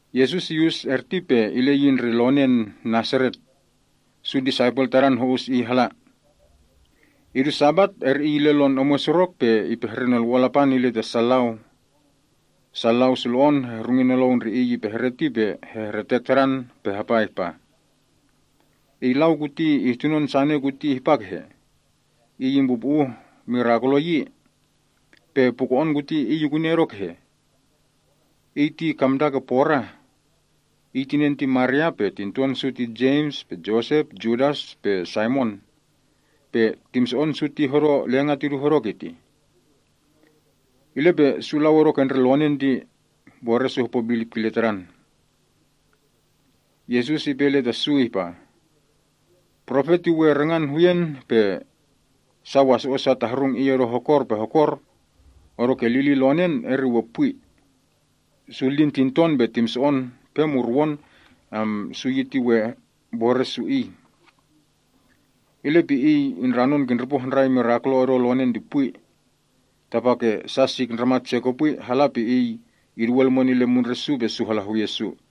Yesus iyus erti pe ile yi ndre lonen Nasaret. Su disaipel Tadan ho‑us iy hala. Idu Sabat eri Iy ile lon omwen surok pe ipehre Nolwo‑on Lapan ile ta sa lau. Sa lau sulo‑on hehrungi nolou ndre Iy ipehre ti pe hehretek Tadan pe hapa ihpa, “Iy lau kuti ihtunon sane kuti ihpa kehe? Iy impupu‑uh mirakulo yi! Pe puko‑on kuti Iy ikuni odo kehe? Iy ti kamda ke porah. Iy tinen ti Maria, pe tinton su ti Jems, Yosep, Yudas pe Saimon. Pe timso‑on su ti hodo lenga’ tidu hodo kitih.” Ile pe su lau odo ke ndre lonen ti mbore’ su hopo bilip kile Tadan. Yesus ipe ile ta su ihpa, “Profet ti we rangan huyen pe sa waso‑o’ sa tahrung Iy odo hokor pe hokor. Odoke lilin lonen eri we pwi. Su lin tinton pe timso‑on pe murwon ti we mbore’ su Iy.” Ile pe Iy indranon kindripo handrai mirakulo odo lonen ti pwi. Tapake sa sik ndramat se kopwi hala pe Iy iduwe lumwen ile mundre’ su pe su hala huye’ su.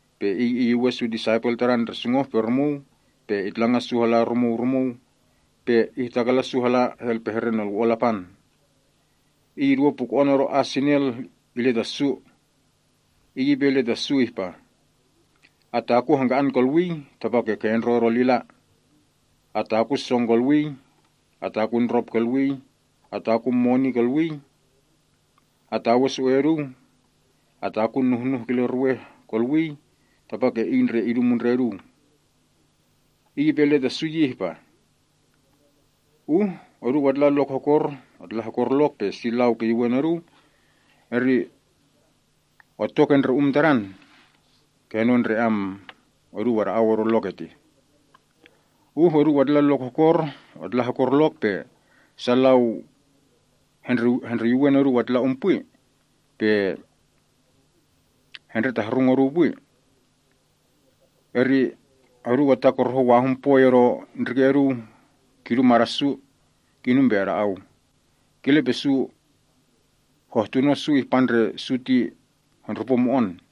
Pe Iy iyuwen su disaipel Tadan ndre sungoh-pe-rumuu, pe itlangan su hala rumuu rumuu, pe ihtakalan su hala helpehre Nolwo‑on Lapan. Iy iduwe puko‑on odo as sinel ile ta su. Iy ipe ile ta su ihpa, “Atakun hangka‑an kolwii, tapake kendro odo lila. Atakun song kolwii. Atakun ndrop kolwii. Atakun moni kolwii. Atawe su‑e’ oduu. Atakun nuhnuh kile ruweh kolwii, tapake iy ndre idu mundren oduu.” Iy ipe ile ta su yi ihpa, “Uh oduu atla hokor lok pe si lau kiyuwen oduu, eri otto ke ndre um tadan uu kenon ndre oduu ada‑au odo lok ertih. Uh oduu atla hokor lok pe sa lau hendreyuwen oduu atla um pwi, pe hendretahrung oduu pwi eri oduu atakorohon wahun poi odo ndrike’ oduu kidu mada’ su, kinum pe ada‑au. Kile pe su hohtuno su ihpa ndre su ti hendrupo mo‑on.”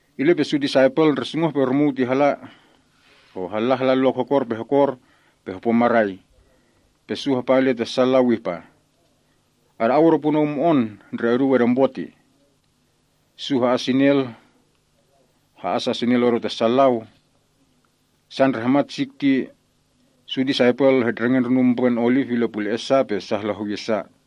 Ile pe su disaipel ndre sungoh-pe-rumuu ti halla hala hokor pe hokor pe hopo marai. Pe su hapa ile ta sa lau ihpa, “Ada‑au odo punou mo‑on ndre oduu edempo tih.” Su ha‑as sa sinel odo ta sa lau. Sa ndre hamat sik ti su disaipel hetndrenge ndronun mbrwen oliv ile pule‑e’ sa, pe sa hala huye’ sa.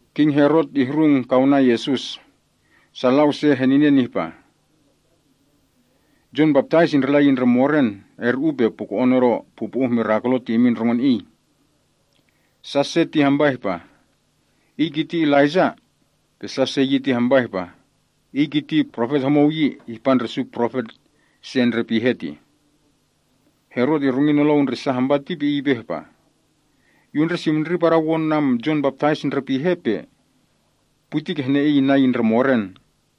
King Herot ihrung kaunan Yesus. Sa lau se heninen ihpa, “Jon Baptais indrila yi ndre moren, erti uu pe puko‑on odo pupu‑uh mirakulo ti imin ndrongon iy.” Sa se ti hampa ihpa, “Iy kiti Profet Elaijah.” Sa se yi ti hampa ihpa, “Iy kiti profet homou yi, ihpa ndre su profet se ndre pihe tih.” Herot ihrungi nolou ndre sa hampa ti pe ipe ihpa, “Yu unsimndri padawon Jon Baptais ti ndre pihe, pe pwi ti kihne iy inna yi ndre moren.”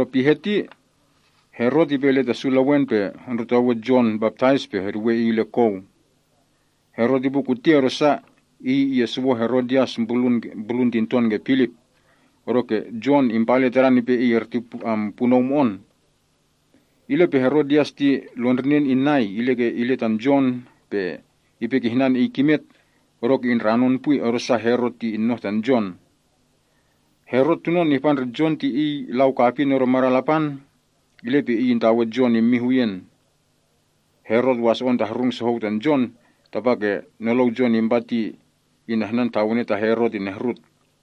Pihe ti, Herot ipe ile ta su lewen pe hondrotowe Jon Baptais pe heduwe iy ile kou. Herot ipu kuti odosa, iy iyesuwon Herodias mbrulun tinton ke Filip, odoke Jon impa ile tadan ipe iy erti punou mo‑on. Ile pe Herodias ti lon ndrinen inai ile tan Jon pe ipe kihnan iy kimet, odoke indranon pwi, odosa Herot ti inoh tan Jon. Herot tunon ihpa ndre Jon ti iy lau kapin odo madan Lapan, ile pe iy intawe Jon immin huyen. Herot waso‑on tahrung sohou tan Jon, tapake nolou Jon impa ti inahnan tawene ta Herot inehrut.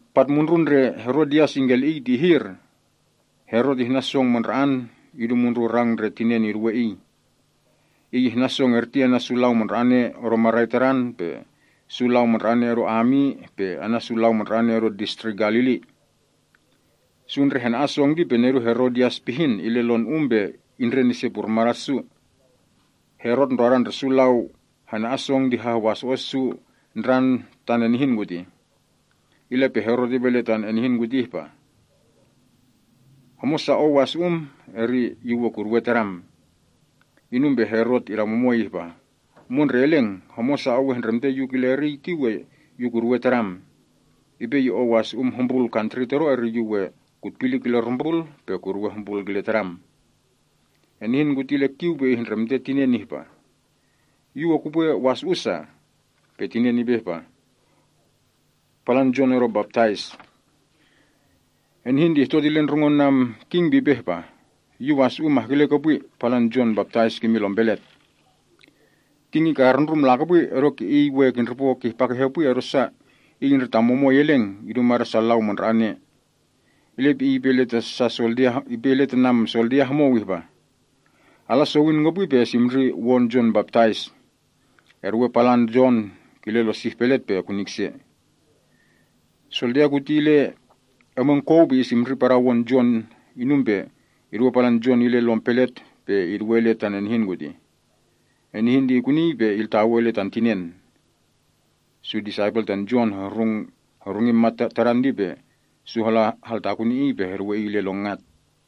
Patmundrun ndre Herodias ingkeli‑iy ti ihir. Herot ihnan song mandra‑an idu mundrun rang ndre tinen iduwe iy idu eriy tih. Iy ihnan song erti ana’ su lau mandra‑ane odo marai tadan, su lau mandra‑ane odo ami, pe ana’ su lau mandra‑ane odo Distrik Galili. Su ndre hana‑an song ti pe nedun Herodias pihin ile lon um pe indren ise purmada’ su. Herot ndrodan ndre su lau hana‑an song ti hahwaso‑o’ su ndran tan enihin kutih. Ile pe Herot ipe ile tan enihin kuti ihpa, “Homosa ou wasu‑um, eri yu we kuduwe tadam.” Inum pe Herot idamumoi ihpa, “Mondre Eleng, homosa ou ehndremte yu kile eriy ti yu we kuduwe tadam. Ipe ye ou wasu‑um hombrul kantri todo, eri yu we kutpili kile rumbrul, pe kuduwe hombrul kile tadam.” Enihin kuti ile kiu pe ihndremte tinen ihpa, “Yu we kupwe wasu‑u sa?” Tinen ihpa, “Palan Jon Baptais.” Enihin ti ihtot ile ndre ndrongon king pe ipe ihpa, “Yu wasu‑u mahkele kopwi, palan Jon Baptais kimin lom pelet.” King ikarundrum lakopwi, odoke iy we kindripo kihpa kehe pwi, odosa iy ‘indretamumoi eleng’ idu mada’ sa lau mandra‑ane tih. Ile pe iy ipe ile ta soldia homou ihpa, “Ala sowin kopwi, pe esimndri won Jon Baptais. Eduwe palan kile lon sih pelet pe ekuni kise.” Soldia kuti ile omwen kou pe isimndri padawon Jon inum pe iduwe palan Jon ile lom pelet pe iduwe ile tan enihin kurtih. Enihin ti ikunii pe iltawei ile tan tinen. Su disaipel tan Jon hohrungi mat tadan ti pe su hala haltakuni iy, pe heltawe iy ile lon ngat.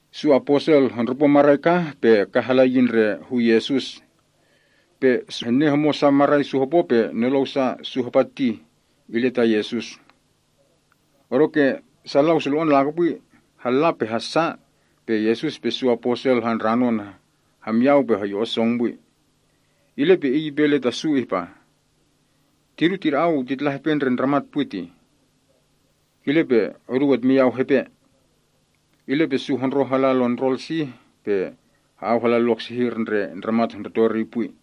Su aposel hondrupo marai kah, pe kah hala yi ndre hu Yesus. Pe su hennen marai sa su hopo pe nolou sa su hapa ti ile ta Yesus. Odoke sa lau sulo‑on lakopwi halla pe hassa, ile pe Yesus pe su aposel handranon hamyau pe heyo‑on song pwi. Ile pe Iy ipe ile ta su ihpa, “Tidu tida‑au titla hepe ndre ndramat pwi tih. Kile pe oduu etmiyau hepe.” Ile pe su hondroh hala ndrol sih pe ha‑au hala lok sehir ndre ndramat hondruto eriy pwi.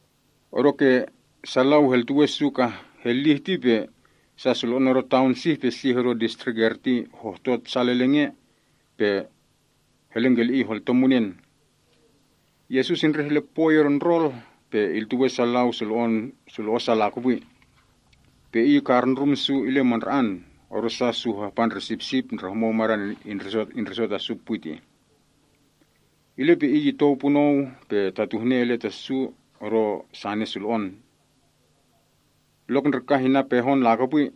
Odoke sa lau heltuwe su ka helih ti pe sa sulo‑on odo taon sih pe sih odo distrik erti hohtot sal eleng ea, pe helengkeli‑iy holto munen. Yesus indreh ile pwoi odo ndrol, pe iltuwe sa lau sulo‑o’ sa lakopwi. Pe Iy ikarndrum su ile mandra‑an, odosa su hahpa ndre sipsip ndre homou madan indriso ta su pwi. Ile pe Iy itou punou pe tatuhne ile ta su odo sane sulo‑on. Lok ndre kah inna pehon lakopwi,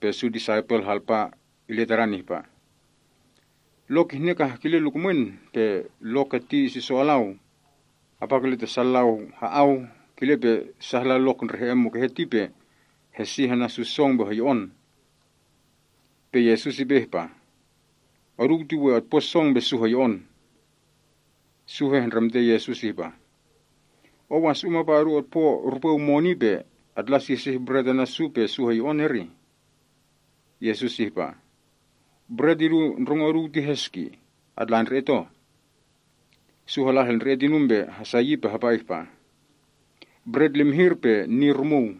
pe su disaipel halpa ile Tadan ihpa, “Lok kihne kah kile lukumwen pe lok keti isiso alau. Apa kile ta sa lau ha‑au, kile pe sa hala lok ndre he‑en mukehe ti pe hesih ana’ su song pe hoyo‑on.” Pe Yesus ipe ihpa, “Oduu ti we otpo song pe su hoyo‑on.” Su hehndremte Yesus, “Ou wasu‑um apa odu otpo rupweu moni pe atla sihsih bret ana’ su pe su hoyo‑on, erih?” Yesus ihpa, “Bret idu ndrongo oduu ti heski? Atla ndre‑et oh.” Su hala helndre‑et inum pe hasa yi pe hapa ihpa, “Bret limihir pe ni rumuu.”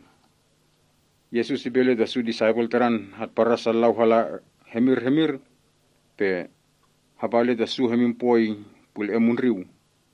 Yesus ipe ile ta su disaipel Tadan hatparan sa lau hala hemir hemir pe hapa ile ta su hemin poi pule‑en mundriu.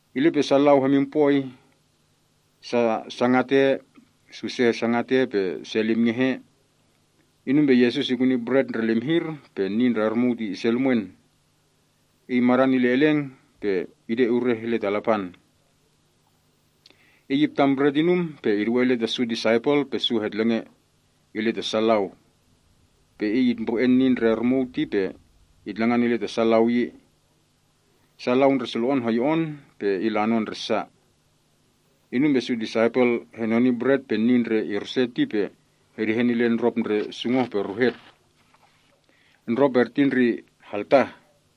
Ile pe sa lau hemin poi. Se sangat ea, pe se limngeh ea. Inum pe Yesus ikuni bret ndre limihir pe ni ndre rumuu ise lumwen. Iy madan ile eleng, pe ide urehen Lapan. Iy iptan bret inum pe iduwe ile ta su disaipel, pe su hetlenge ile ta sa lau. Pe Iy itmbre‑e ni ndre rumuu ti pe itlangan ile ta sa lau yi. Sa lau ndre sulo‑on hoyo‑on pe ilanon ndre sa. Inum pe su disaipel hadaparngan bret pe ni ndre irswe ti pe hedehen ile ndrop ndre sungoh-pe-ruhet. Ndrop erti ndre haltah.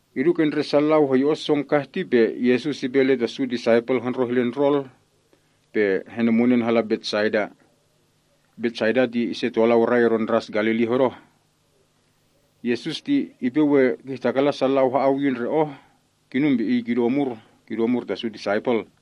Idu ke ndre sa lau hoyo‑on song kah ti pe Yesus ipe ile ta su disaipel hondroh ile ndrol pe henemunen hala Betsaida. Betsaida ti ise tolau rai odo ndras Galili hodoh. Yesus ti ipe we kihtakalan sa lau ha‑au yi ndre oh, kinum pe Iy kidu omur ta su disaipel.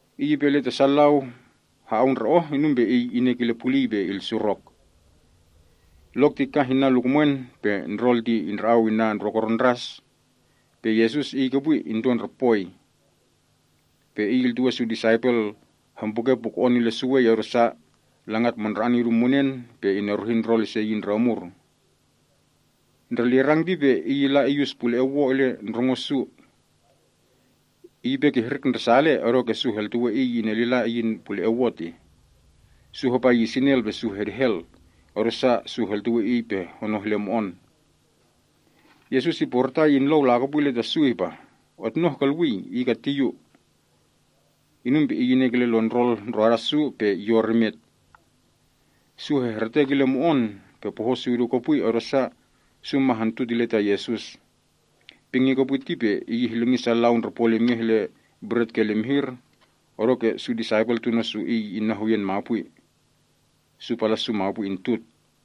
Iy ipe ile ta sa lau ha‑au ndre oh, inum pe Iy inek ile puliy pe ilsurok. Lok ti kah inna lukumwen pe ndrol ti indra‑au inna ndrokoron ndras, pe Yesus Iy kopwi into ndre poi. Pe Iy iltuwe su disaipel hempuke puko‑on ile suwei, odosa langat mandra‑an idu munen pe ineruhi ndrol ise yi ndre omur. Ndre lirang ti pe Iy illa iyus pule‑en wo ile ndrongo su. Iy ipe kihrik ndresale, odoke su heltuwe Iy inelila iyin pule‑en wo. Su hapa yi sinel pe su hedehel, odosa su heltuwe Iy pe honoh ile mo‑on. Yesus iporitai inlou lakopwi ile ta su ihpah, “Otnoh kolwii. Iy keti Yu.” Inum pe Iy inek ile lon ndrol ndroda su, pe yor imet. Su hehretek ile mo‑on pe poho’ su idu kopwi, odosa, su ma hontut ile ta Yesus. Pingi kopwi ti pe Iy ihlingi sa lau ndre polimngeh ile bret ke limihir, odoke su disaipel tuno’ su Iy inna huyen mapwi. Su pala’ su mapwi intut.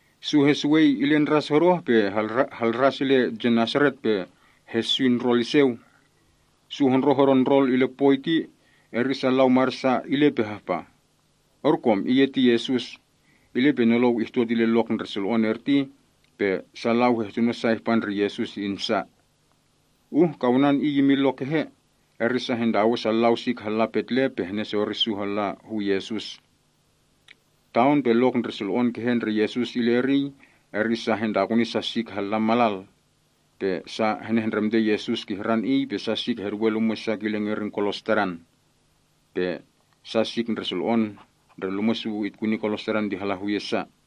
Su hesuwei ile ndras hodoh pe halras ile Genesaret pe heswi ndrol iseu. Su hondroh odo ndrol ile poi ti pe sa lau mada’ sa ile, pe hahpa, “Orkom, iy eti Yesus.” Ile pe nolou ihtot ile lok ndre sulo‑on odo erti, pe sa lau hehtuno sa ihpa ndre Yesus insa. Uh kaunan Iy imin lok kehe, eri sa hentawe sa lau sik hala petle pe henesori su halla hu Yesus. Taon pe lok ndre sulo‑on kehe ndre Yesus ile eriy, eri sa hentakuni sa sik halla malal. Pe sa henehndremte Yesus kihran iy pe sa sik heduwe lumwe’ sa kile ngerin kolos Tadan. Pe sa sik ndre sulo‑on ndre lumwe’ sa itkuni kolos Tadan ti hala huye’ sa.